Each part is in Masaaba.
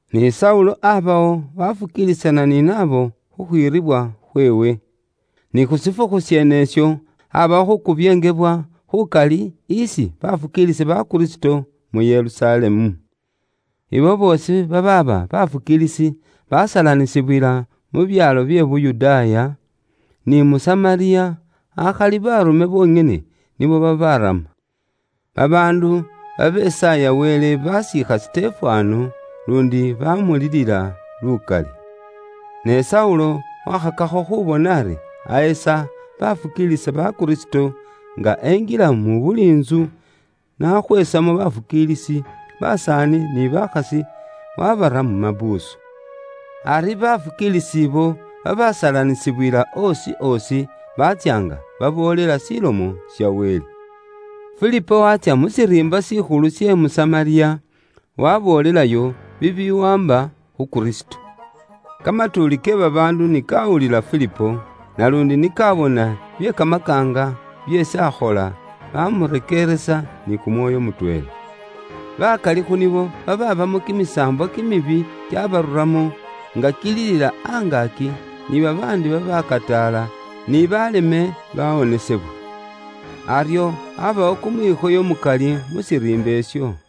Ni Saulo abawo, wafukiilisana ni nabo khukhwiiribwa khweewe. Saulo akubyeenga baafukiilisi ba Kristo Ni khu shifukhu sheenesho, aabawo khuukubyeengebwa khukali isi baafukiilisi ba Kristo mu Yerusalemu. abo boosi babaaba bafukiilisi basalanisibwila mu byaalo bye Yuda, ni mu Samariya, akhali baarume bonyene nibo babaarama. Babaandu babesaaya Wele basiikha Sitefano, luundi baamulilila lukali. Ne Saulo waakhakakho khuubona ari ahesa baafukiilisi ba Kristo, nga enjila mu buli intsu, nakhweesamo baafukiilisi, basaani ni bakhasi, waabara mu mapuusu. Ari baafukiilisi abo babaasalanisibwila oosi oosi baatsya nga baboolela Ilomo ya Wele. Filipo waatsya mu shiriimba shikhulu she mu Samariya, waaboolelayo bibiwaamba khu Kristo. Kamatuuli ke babaandu ni kaawulila Filipo, naluundi ni kaabona bye kamakaanga byeesi aakhola, baamurekeeresa ni kumwoyo mutweela. Bakali khu nibo babaabamo kimisaambwa kimibi kyabaruramo, nga kililila angaaki, ni babaandi babaakataala, ni baaleme, baawonesebwa. Aryo aabawo kumwikhoyo mukali mu shiriimba isho.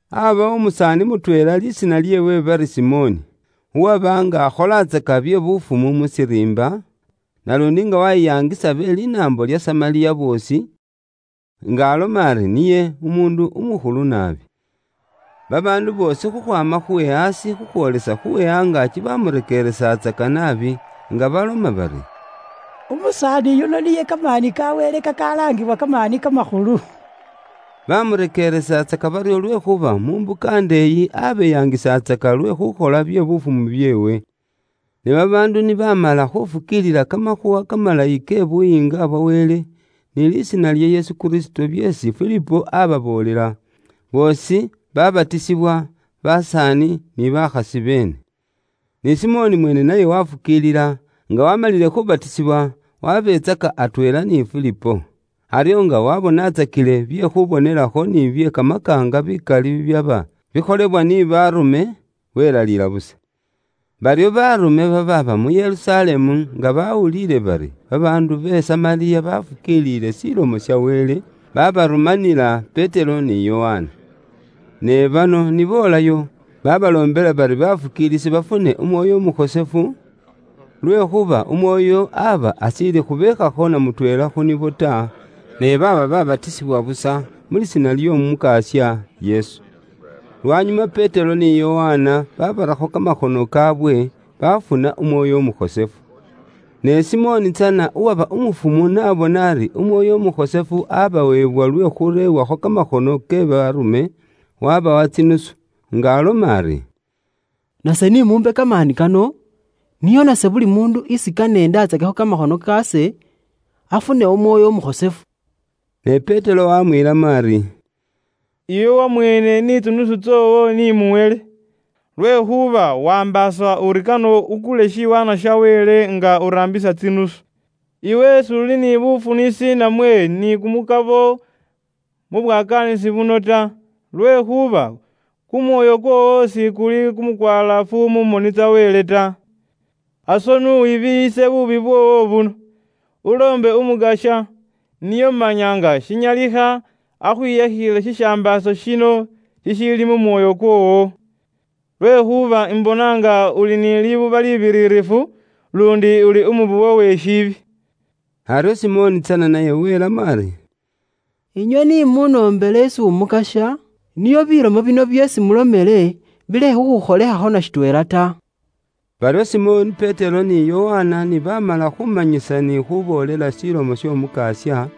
Aabawo umusaani mutweela lisiina lyeewe bari Simoni, uwaba nga akholatsaka bye bufumu mu shiriimba, naluundi nga waayiyangisa be linaambo lya Samariya boosi, nga aloma ari niye umuundu umukhulu naabi. Babaandu boosi khukhwaama khu we aasi khukhwoola khu we angaaki baamurekeelesatsaka naabi, nga baloma bari, “Umusaani yuno niye kamaani ka Wele kakalaangibwa kamaani kamakhulu.” Baamurekeelesatsaka baryo lwekhuuba mu mbuka ndeeyi abeeyangisatsaka lwe khukhola bye bufumu byeewe. Ne babaandu ni baamala khufukiilila kamakhuuwa kamalayi ke Buyiinga bwa Wele, ni lisiina lya Yesu Kristo byeesi Filipo ababoolela, boosi babatisibwa, basaani ni bakhasi beene. Ni Simoni mweene naye wafukiilila, nga waamalile khubatisibwa, wabetsaka atweela ni Filipo. Aryo nga wabonatsakile bye khubonelakho ni bye kamakaanga bikali bibyaba bikholebwa ni baarume, welaliila busa. Baryo baarume babaaba mu Yerusalemu nga baawuliile bari babaandu be Samariya baafukiiliile Ilomo ya Wele, baabarumanila Petero ni Yokana. Ne bano ni boolayo, baabaloombela bari bafukiilisi bafune Umwoyo Umukhosefu, lwekhuuba Umwoyo aba ashiili khubeekhakho na mutweela khu nibo ta, ne baaba babatisibwa busa mu lisiina ly'Omukasya Yesu. Lwanyuma Petero ni Yokana babarakho kamakhono kaawe, bafuna Umwoyo Umukhosefu. Ne Simoni tsana uwaba umufumu n'abona ari Umwoyo Umukhosefu abaweebwa lwe khureewakho kamakhono ke baarume, wabawa tsinusu, nga aloma ari, “Nase ni muumbe kamaani kano, nio nase buli muundu isi kane indatsakekho kamakhono kaase, afune Umwoyo Umukhosefu.” Ne Petero waamwiilamo ari, “Iwe wamweene ni tsinusu tsoowo ni muhele, lwekhuuba waambaasa uri kane ukule shiwaanwa sha Wele nga uraambisa tsinusu! Iwe s'uli ni bufunisi namwe ni kumukabo mu bwakaanisi buno ta, lwekhuuba kumwoyo kwoowo shikuli kumukwalaafu mu moni tsa Wele ta. Aso ni wibiiyise buubi bwoowo buno, uloombe Umukasya, nio manya nga shinyalikha akhwiyakhile shishambaaso shino shishiili mu mwoyo kwoowo. Lwekhuuba ise imbona nga iwe uli ni libuba libiririfu, luundi uli umubowe we bubwoonaki.” Aryo Simoni tsana naye welamo ari, “Inywe ni munoombele isi Umukasya, nio bilomo bino byeesi mulomele bilekhe khukhukholekhakho na shitweela ta.” Baryo Simoni Petero ni Yokana ni baamala khuumanyisa ni khuuboolela Ilomo y'Omukasya,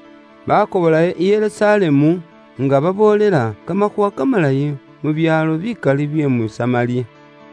baakobolayo i Yerusalemu, nga baboolela Kamakhuuwa Kamalayi mu byaalo bikali bye mu Samariya.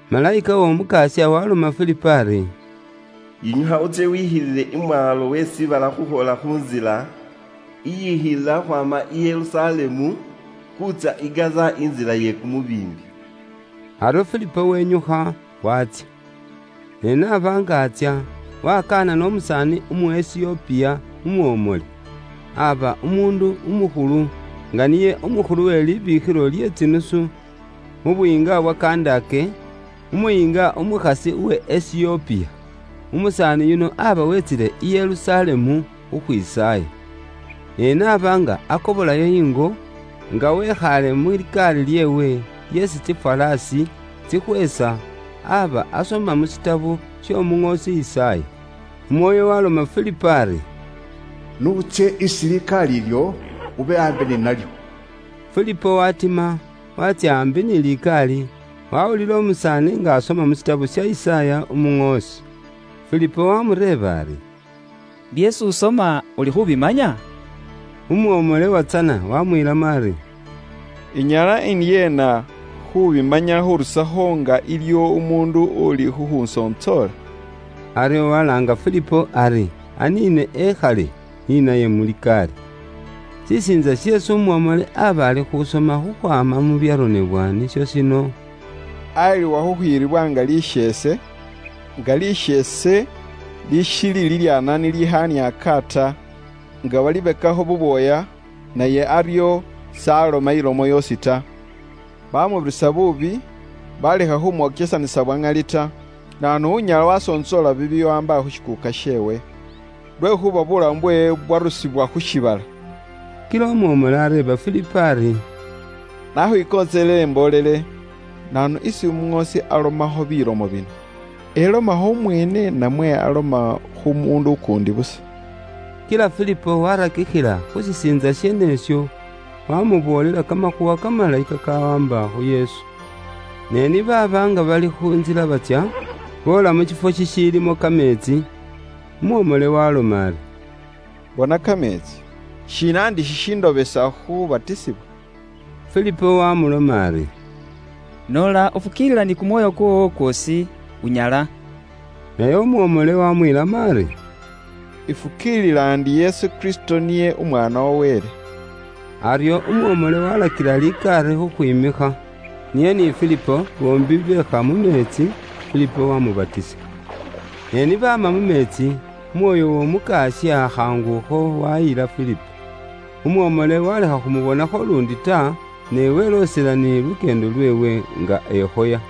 Malayika w'Omukasya waaloma Filipo ari, “Yinyukha utsye wikhilile imwaalo we shiibala khukhwoola khu ntsila iyikhilila khukhwaama i Yerusalemu, khuutsya i Gaza, intsila iye kumubiimbi.” Aryo Filipo wenyukha, waatsya. Ne n'aba nga atsya, waakanana umusaani umu Esiyopiya umwomole. Aaba umuundu umukhulu, nga niye umukhulu we libiikhilo lye tsinusu mu buyiinga bwa Kandake, umuyiinga umukhasi uwe Esiyopiya. Umusaani yuno aaba weetsile i Yerusalemu khukhwisaaya. Ne n'aba nga akobolayo ingo, nga wikhaale mu likaali lyeewe lyeesi tsiŋwaaŋwa tsikhweesa, aaba asoma mu shitabo sh'omuŋoosi Yisaaya. Umwoyo waloma Filipo ari, “N'utsye isi likaali ilyo, ube aambi ni nalyo.” Filipo waatima, waatsya aambi ni likaali, waawulila umusaani nga asoma mu shitabo sha Yisaaya umuŋoosi. Filipo waamureeba ari, “Byeesi usoma uli khubimanya?” Umwomole watsana wamwiilamo ari, “Inyala indyeena khuubimanya khurusakho nga iliwo umuundu uuli khukhusontsoola?” Aryo walaanga Filipo ari aniine ekhale ni naye mu likaali. Shisiintsa sheesi umwomole aaba ali khuusoma khukhwaama mu byaronebwa bikhosefu nisho shino, “Aayiliwa nga lisheese ni liyilibwa khukhwiiribwa, nga khasheese ni khakhaniaaka ta nga bakhabekakho bubwooya, naye aryo s'aloma ilomo yoosi ta. Bamubirisa buubi, balekha khumwokyesanisa bwa ŋali ta. Naanu unyala wasontsoola bibiwaamba khu shikuuka sheewe? Lwekhuuba buulamu bweewe bwarusibwa khu shiibala.” Kila umwomole areeba Filipo ari, “Nakhwikontseleele imboolele, naanu isi umuŋoosi alomakho bilomo bino? Elomakho umweene namwe aloma khu muundu ukuundi busa?” Kila Filipo waarakikhila khu byaronebwa bikhosefu byeene bino, waamuboolela kamakhuuwa kamalayi kakawaamba khu Yesu. Ne ni baaba nga bali khu ntsila batsya, boola mu shiifwo shishiilimo kameetsi, umwomole waaloma ari, “Bona kameetsi, shiina ndi shishindobesa khubatisibwa?” Filipo waamuloma ari, “Noola ufukiilila ni kumwoyo kwoowo kwoosi, unyala waabatisibwa.” Naye umwomole waamwiilamo ari, “Ifukiilila ndi Yesu Kristo niye Umwaana wa Wele.” Aryo umwomole waalakila likaali khukhwiimikha. Niye ni Filipo boombi beekha mu meetsi, Filipo wamubatisa. Ne ni baama mu meetsi, Umwoyo w'Omukasya khaangukho wayila Filipo. Umwomole walekha khumubonakho luundi ta, ne weloosela ni lukyeendo lweewe nga ekhoya.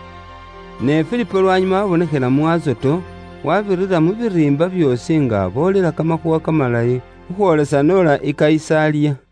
Ne Filipo lwanyuma waabonekhela mu Azoto, waabira mu biriimba byoosi nga aboolela kamakhuuwa kamalayi khukhwoolesa n'ola i Kayisaliya.